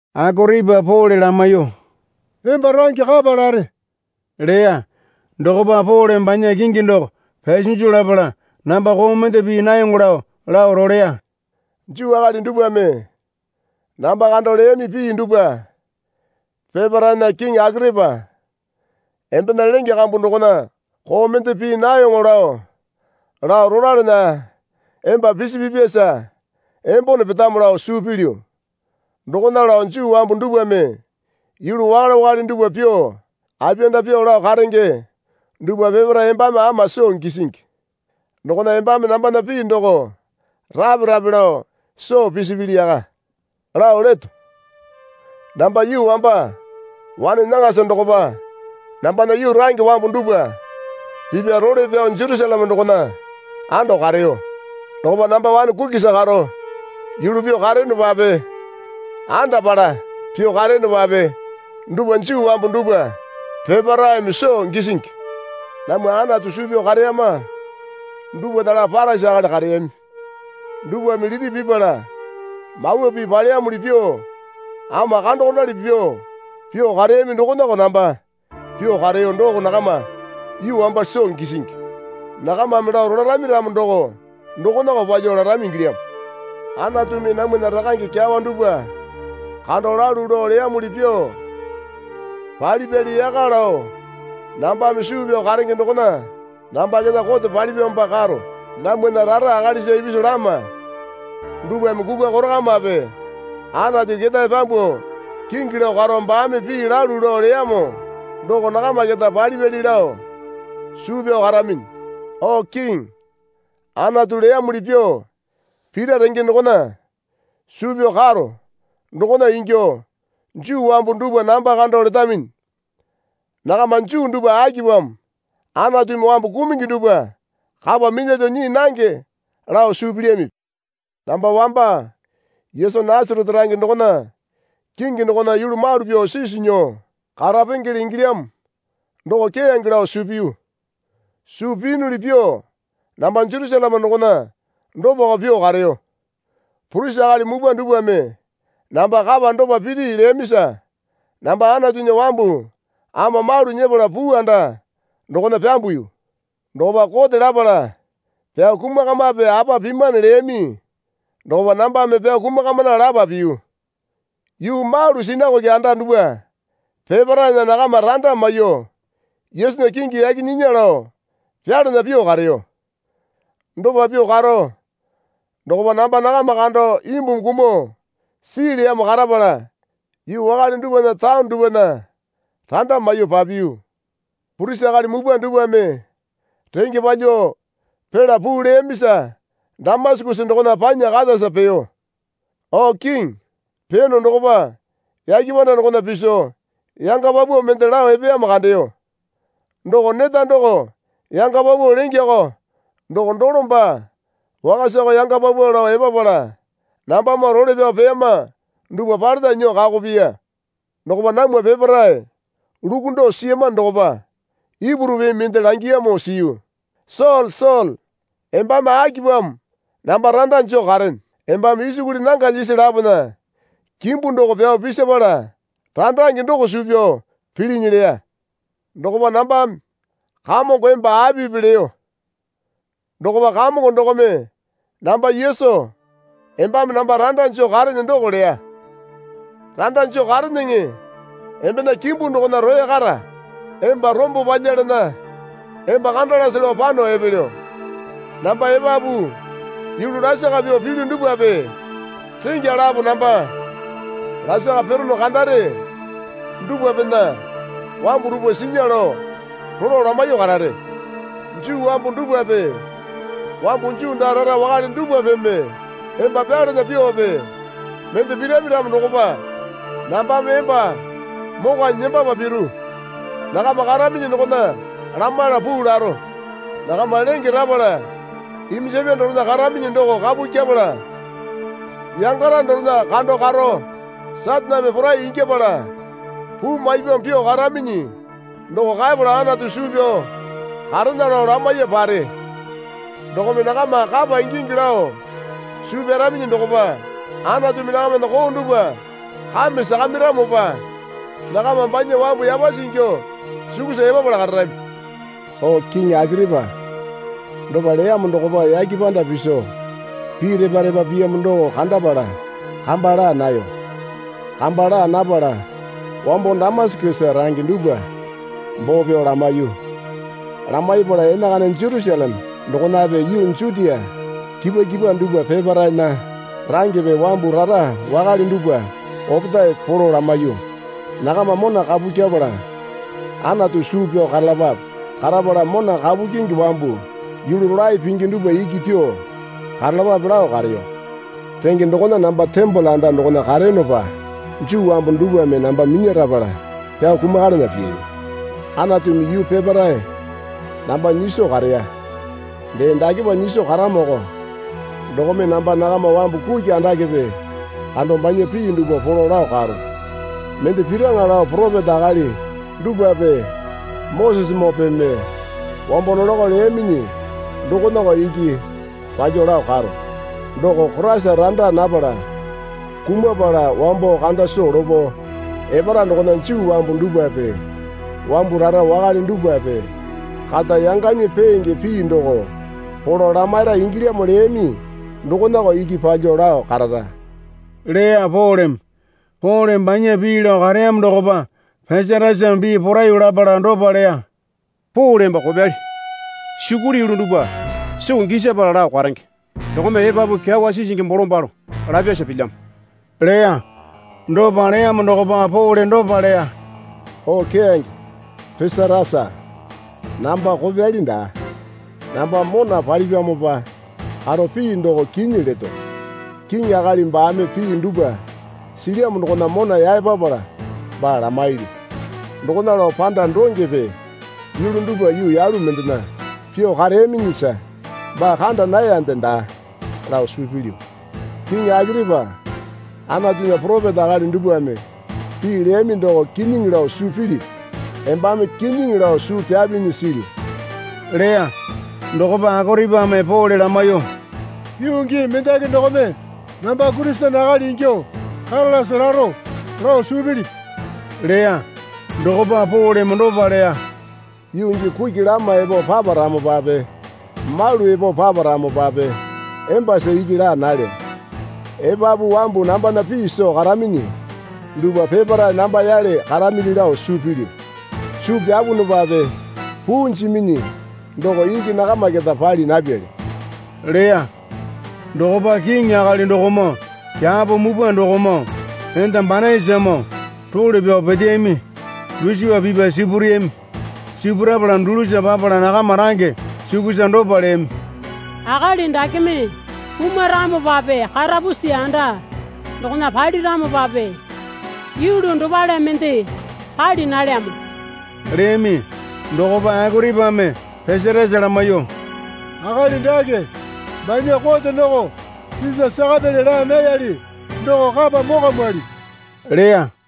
Akoripa Pole lamaiyuo, Emba range kapa lare leya. Dokopa Poleme banya kingi doko pyasinju lapala namba koo mende pii nayoŋo lao lao roleya. Juu akali dupwame namba kando leyami pii dupwa peparaena, kiŋi Akoripa, embena lenge kambu dokona koo mende pii nayoŋo lao lao rolalana emba pisipipyasa embone petamo lao suu pilyu. Dokona lao Juu wambu dupwame yulu wakale wakale dupwa pyuo apiyanda pyuo lao karenge dupwa peparae embame ama soo gisingi. Dokona embame nambana pii doko rape rape lao soo pisapili yaka lao leto. Namba yuu wamba wane nyaŋasa dokopa nambana yuu range wambu dupwa pipya role pyao Jerusaleme dokona ando kareyo. Dokopa namba wane kukisa karo yulu pyuo kareyonopape andapala pyuo kareyonopape dupwa Juu wambu dupwa peparaeme soo gisingi. Namwa Anatu suu pyao kareyama dupwana lapo Parisi akali kareyami dupwame liti pipala Mawa Pii paleyamuli pyuo ama kandokondali pyuo pyuo kareyami dokonako namba pyuo kareyo doko nakama yuu wamba soo gisingi. Nakamame lao rolarami ramo doko dokonako palyuo larami ingilyamo. Anatumi namwana rakange kyawa dupwa kando lalu lao leyamuli pyuo palipyali yaka lao nambame suu pyao karenge dokona namba keta kote palipyamopa karo. Namwana rara akalisa ipisu lama dupwame kukwa korakamape Anatu ketae pyambuo kingi lao karo baame pii lalu lao leyamo doko nakama keta palipyali lao suu pyao karaminyi. O Kiŋi, Anatu leyamuli pyuo pira renge dokona suu pyao karo dokona ingyuo Juu wambu dupwa namba kando letaminyi. Nakama Juu dupwa akipamo Anatumi wambu kumungi dupwa kapa minyalyuo nyii nange lao suu pilyamipi? Namba wamba Yesu Nasarete range dokona kingi dokona yulu malu pyuo sisu nyuo karapengele ingilyamo doko keyange lao suu piyu. Suu piyunuli pyuo namba Jerusaleme dokona dopako pyuo kareyo. Purisi akali mupwa dupwame namba kapa dopa piri leyamisa namba Anatunya wambu ama malu nyepala puu anda dokona pyambuyu. Dokopa kote lapala pyao kumakamape apa pimane leyami dokopa nambame pyao kumukamana lapa piyu. Yuu malu sinakoke anda dupwa peparaena nakama randa maiyuo Yesunya kingi yaki nyinya lao pyalana pyuo kareyo. Dopa pyuo karo dokopa namba nakama kando imbumi kumuo sii leyamo karapala yuu wakale dupwana taone dupwana randa maiyuo papiyu. Purisi akali mupwa dupwame renge palyuo pila puu leyamisa Damasakesa dokona panya katasa peyo. O Kiŋi, peyono dokopa yake panda dokona piso yanga paupau mende lao epeyamo kandeyo. Doko neta doko yanga paupau lengeko doko dolo baa wakasako yanga paupau lao epapala nambamoo role pyao peyama dupwa paleta nyuo kako piya. Dokopa namwa peparae lukundo siyamano dokopa Ipuru pii mende langiyamo siyu. Sole, Sole, embame akipamo namba randa joo karene? Embame isukuli nanga lyisi lapona kimbu doko pyao pisapala randange doko suu pyao pilinyi leya. Dokopa nambame, Kamongo, emba apipi? leyo. Dokopa Kamongo dokome, Namba Yesu, embame namba randa joo karene doko leya. Randa joo kareneŋe embena kimbu dokona roya kara. Emba rombo palyalana emba kandalase lao pano epelyo. Namba epapu yulu lasaka pyuo pilyu dupwape rengya lapo namba lasaka pirono kandare dupwapena wambu dupwa sinya lao rolo lamaiyuo karare. Juu wambu dupwape wambu Juu daa raa wakale dupwapeme emba pyalana pyuope mende pirami ramo dokopa nambame emba mokwanyi nembapa piru. Nakama karaminyi dokona lamaiyala puu laro. Nakama lenge rapala iminjapya dorena karaminyi doko kapu kyepala yangara dorena kando karo Sataneme porai ingyapala puu maipyamo pyuo karaminyi doko kaepala Anatu suu pyao karena lao lamaiya pare. Dokome nakama kapa ingingi lao suu pyaraminyi dokopa Anatumi nakamana koo dupwa kame sakamairamopa nakama banya wambu yapasi ingyuo sukusa epapala kararami. O kiŋi Akoripa, dopa leyamo dokopa yake panda piso pii repa repa piyamo doko kandapala kamba laa nayo. Kamba laa napala wambo Damasakesa range dupwa boo pyao lamaiyu. Lamaipala enakana Jerusaleme dokonape yuu Jutia kipwa kipwa dupwa peparaena rangepe wambu rara wakale dupwa opetae polo lamaiyuo, Nakama mona kapu kyepala Anatu suu pyao karalapape. Karapala mona kapu kyingi wambu yulu rolae pingi dupwa iki pyuo karalapape, lao kareyo. Renge dokona namba tembole anda dokona kareyonopa Juu wambu dupwame namba minyarapala pyao kumakalana piyami. Anatumi yuu peparae namba nyiso kareya. Dee dakepa nyiso karamoko dokome namba nakama wambu kuki andakepe kando banya pii dupwa polo lao karo. Mende piraŋa lao poropeta akali dupwape Mosesemoopeme wambo nolakao leyaminyi dokonako iki palyuo lao karo. Doko Koraisa randa napala kumapala wambo kanda soo lopo epara dokona Juu wambu dupwape wambu rara wakale dupwape kata yanganyi peenge pii doko polo lamaira ingilyamo leyami dokonako iki palyuo lao karara, leya Poleme. Poleme banya pii lao kareyamo dokopa Pesatasame pii poraiyuo lapala dopa leya. Pole emba kopyali. Sukuli yulu dupwa soo gisapala lao karenge dokome epapu kyawa sisingi bolombalo lapyasa pilyamo leya. Dopa leyamo dokopa Pole dopa leya. O keyange Pesatasa, namba kopyali daa. Namba mona palipyamopa karo pii doko kinyi leto. Kiŋi akali baame pii dupwa silyamo dokona mona yaepapala baa lamailyu. Dokona lao panda dongepe yulu dupwa yuu yalu mendena pyuo kareyaminyisa baa kanda nayande daa lao suu pilyu. Kiŋi Akoripa, Anatunya poropeta akali dupwame pii leyami doko kinyiŋi lao suu pilipi? Embame kinyiŋi lao suu pyapinyi silyu, leya. Dokopa Akoripame Pole lamaiyuo, Yuu gii mendaki dokome namba Kurisene akali ingyuo karalase laro lao suu pilipi? leya. Dokopa Poleme dopa leya. Yuu gii kuki lama epo paparamopape malu epo paparamopape embasa iki laa nalyo. Epapu wambu nambana pii soo karaminyi dupwa peparae namba yale karamili lao suu pilyu. Suu pyapunupape puu jiminyi doko iki nakama keta pali napyali leya. Dokopa kiŋi akali dokomoo kyapo mupwa dokomoo enda Banaisamoo role pyao peteyami dusipa pipya sipureyami. Sipurapala dulusa papala nakama range sukusa dopa leyami. Akali dakeme kumaramopape karapusi anda dokona paliramopape yulu dopale mende pali nalyamo leyami. Dokopa Akoripame Pesatasa lamaiyuo, Akali dake banya kote doko Sisa sakapyali laa nayali doko kapa mokwamwali, leya.